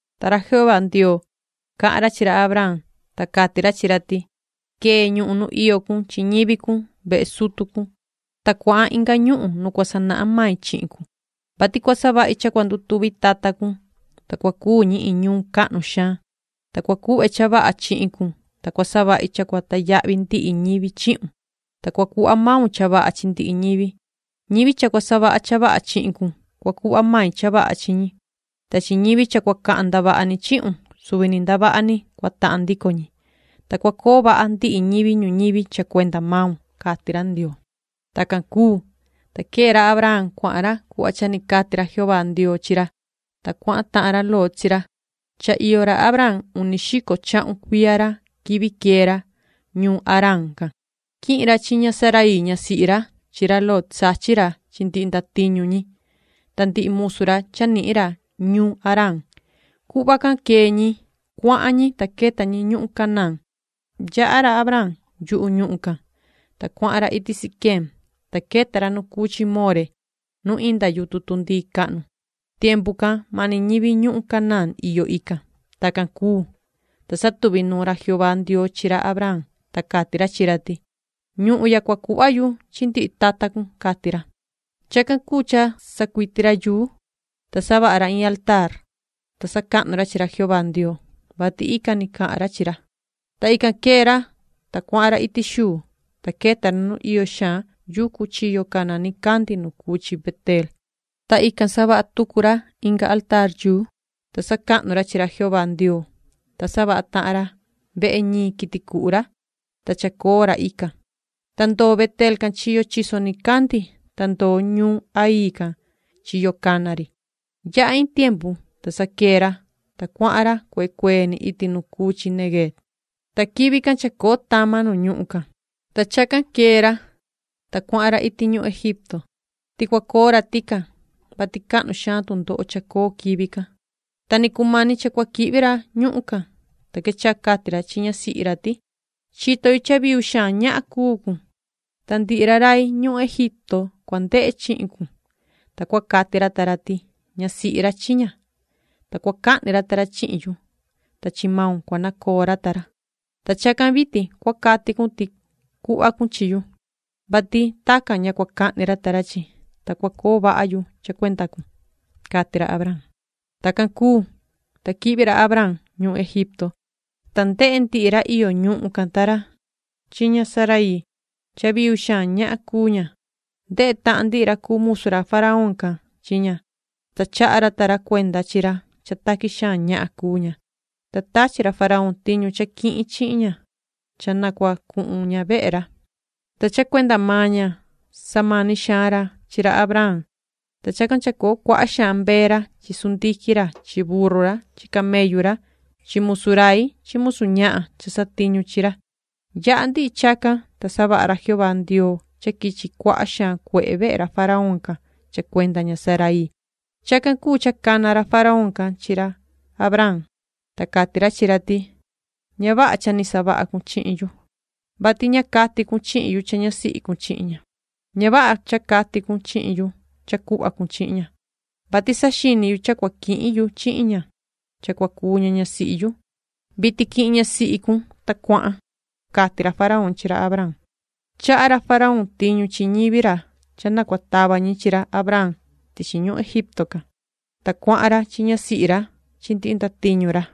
Ta ra Jehová Ndioo, cahan ra chi ra Abraam, ta cati ra chi ra ti:” Quee ñuhun nu iyo cun chi ñivi cun, vehe sutu cun, ta cuahan inga ñuhun nu cua sanahan mai chihin cun, vati cua savahi cha cua ndutuvi tata cun, ta cua cuu ñi iin ñuun cahnu xaan, ta cua cuhve cha vaha chihin cun, ta cua savahi cha cua tayahvi ndihi ñivi chihun, ta cua cuhva maun cha vaha chi ndihi ñivi. Ñivi cha cua savaha cha vaha chihin cun, cua cuhva mai cha vaha chi ñi, ta chi ñivi cha cua cahan ndavaha ni chihun suvi ni ndavaha ni, cua tahan ndico maan ñi, ta cua coo vaha ndihi ñivi ñuñivi cha cuenda maun”, cati ra Ndioo. Tacan cuu, ta quee ra Abraam cuahan ra cuhva cha ni cati ra Jehová Ndioo chi ra, ta cuahan tahan ra Lot chi ra. Cha iyo ra Abraam uni xico chahun cuiya ra quivi quee ra, ñuun Haraan can. Quihin ra chi ña Saraii ñasihi ra chi ra Lot sachin ra chi ndihi ndatiñu ñi, ta ndihi musu ra cha nihin ra ñuun Haraan. Cuhva can quee ñi, cuahan ñi ta queta ñi ñuhun Canaán. Yaha ra Abraam yuhu ñuhun can, ta cuahan ra iti Siquem, ta queta ra nu cuu chi More nu inda yutun tundii cahnu. Tiempu can mani ñivi ñuhun Canaán iyo ican. Tacan cuu, ta satuvi nuun ra Jehová Ndioo chi ra Abraam, ta cati ra chi ra ti: “Ñuhun ya cua cuhva yu chi ndihi tata cun”, cati ra. Chacan cuu cha sacuiti ra yuu, ta savaha ra iin altaar, ta sacahnu ra chi ra Jehová Ndioo, vati ican ni cahan ra chi ra. Ta ican quee ra, ta cuahan ra iti xuu, ta queta ra nu iyo xaan yucu chiyo cana nicandi nu cuu chi Beteel, ta ican savaha tucu ra inga altaar, ta sacahnu ra chi ra Jehová Ndioo, ta savaha tahan ra vehe ñiin quiti cuhu ra, ta chacoo ra ican, ta ndoo Beteel can chiyo chiso nicandi, ta ndoo ñuun Hai can chiyo cana ri. Yaha iin tiempu, ta sa quee ra, ta cuahan ra cuee cuee ni iti nu cuu chi Neguev. Ta quivi can chacoo tama nu ñuhun can, ta chacan quee ra, ta cuahan ra iti ñuhun Egipto, ti cua coo ra tican, vati cahnu xaan tundoho chacoo quivi can. Ta ni cumani cha cua quihvi ra ñuhun can, ta quechaha cati ra chi ñasihi ra ti: “Chito yu cha viu xaan ñahan cuu cun, ta ndihi ra rai ñuhun Egipto cua ndehe chihin cun, ta cua cati ra ta ra ti: ‘Ñasihi ra chi ña’, ta cua cahni ra ta ra chihin yu, ta chi maun cua nacoo ra ta ra. Ta chacan vitin cua cati cun ti cuhva cun chihin yu, vati tacan ña cua cahni ra ta ra chi, ta cua coo vaha yu cha cuenda cun”, cati ra Abraam. Tacan cuu, ta quihvi ra Abraam ñuhun Egipto, ta ndehe ndihi ra iyo ñuhun can ta ra chi ña Saraii cha viu xaan ñahan cuu ña. Ndehe tahan ndihi ra cuu musu ra faraón can chi ña, ta chaha ra ta ra cuenda chi ra cha taqui xaan ñahan cuu ña, ta tachi ra faraón tiñu cha quihin chihin ña cha na cua cuhun ña vehe ra. Ta cha cuenda maan ña samani xaan ra chi ra Abraam, ta chacan chacoo cuaha xaan mbee ra chi chivu ra chi sundiquin ra chi burru ra chi camellu ra chi musu rai chi musu ñahan cha satiñu chi ra. Yaha ndihi chacan, ta savaha ra Jehová Ndioo cha quichi cuaha xaan cuehe vehe ra faraón can cha cuenda ña Saraii. Chacan cuu cha cana ra faraón can chi ra Abraam, ta cati ra chi ra ti: “Ña vaha cha ni savaha cun chihin yu, vati ña cati cun chihin yu cha ñasihi cun chihin ña. Ña vaha cha cati cun chihin yu cha cuhva cun chihin ña, vati saxini yu cha cua quihin yu chihin ña cha cua cuu ña ñasihi yu. Vitin quihin ñasihi cun, ta cuahan”, cati ra faraón chi ra Abraam. Chaha ra faraón tiñu chi ñivi ra cha na cua tava ñi chi ra Abraam tichi ñuhun Egipto can, ta cuahan ra chi ñasihi ra chi ndihi ndatiñu ra.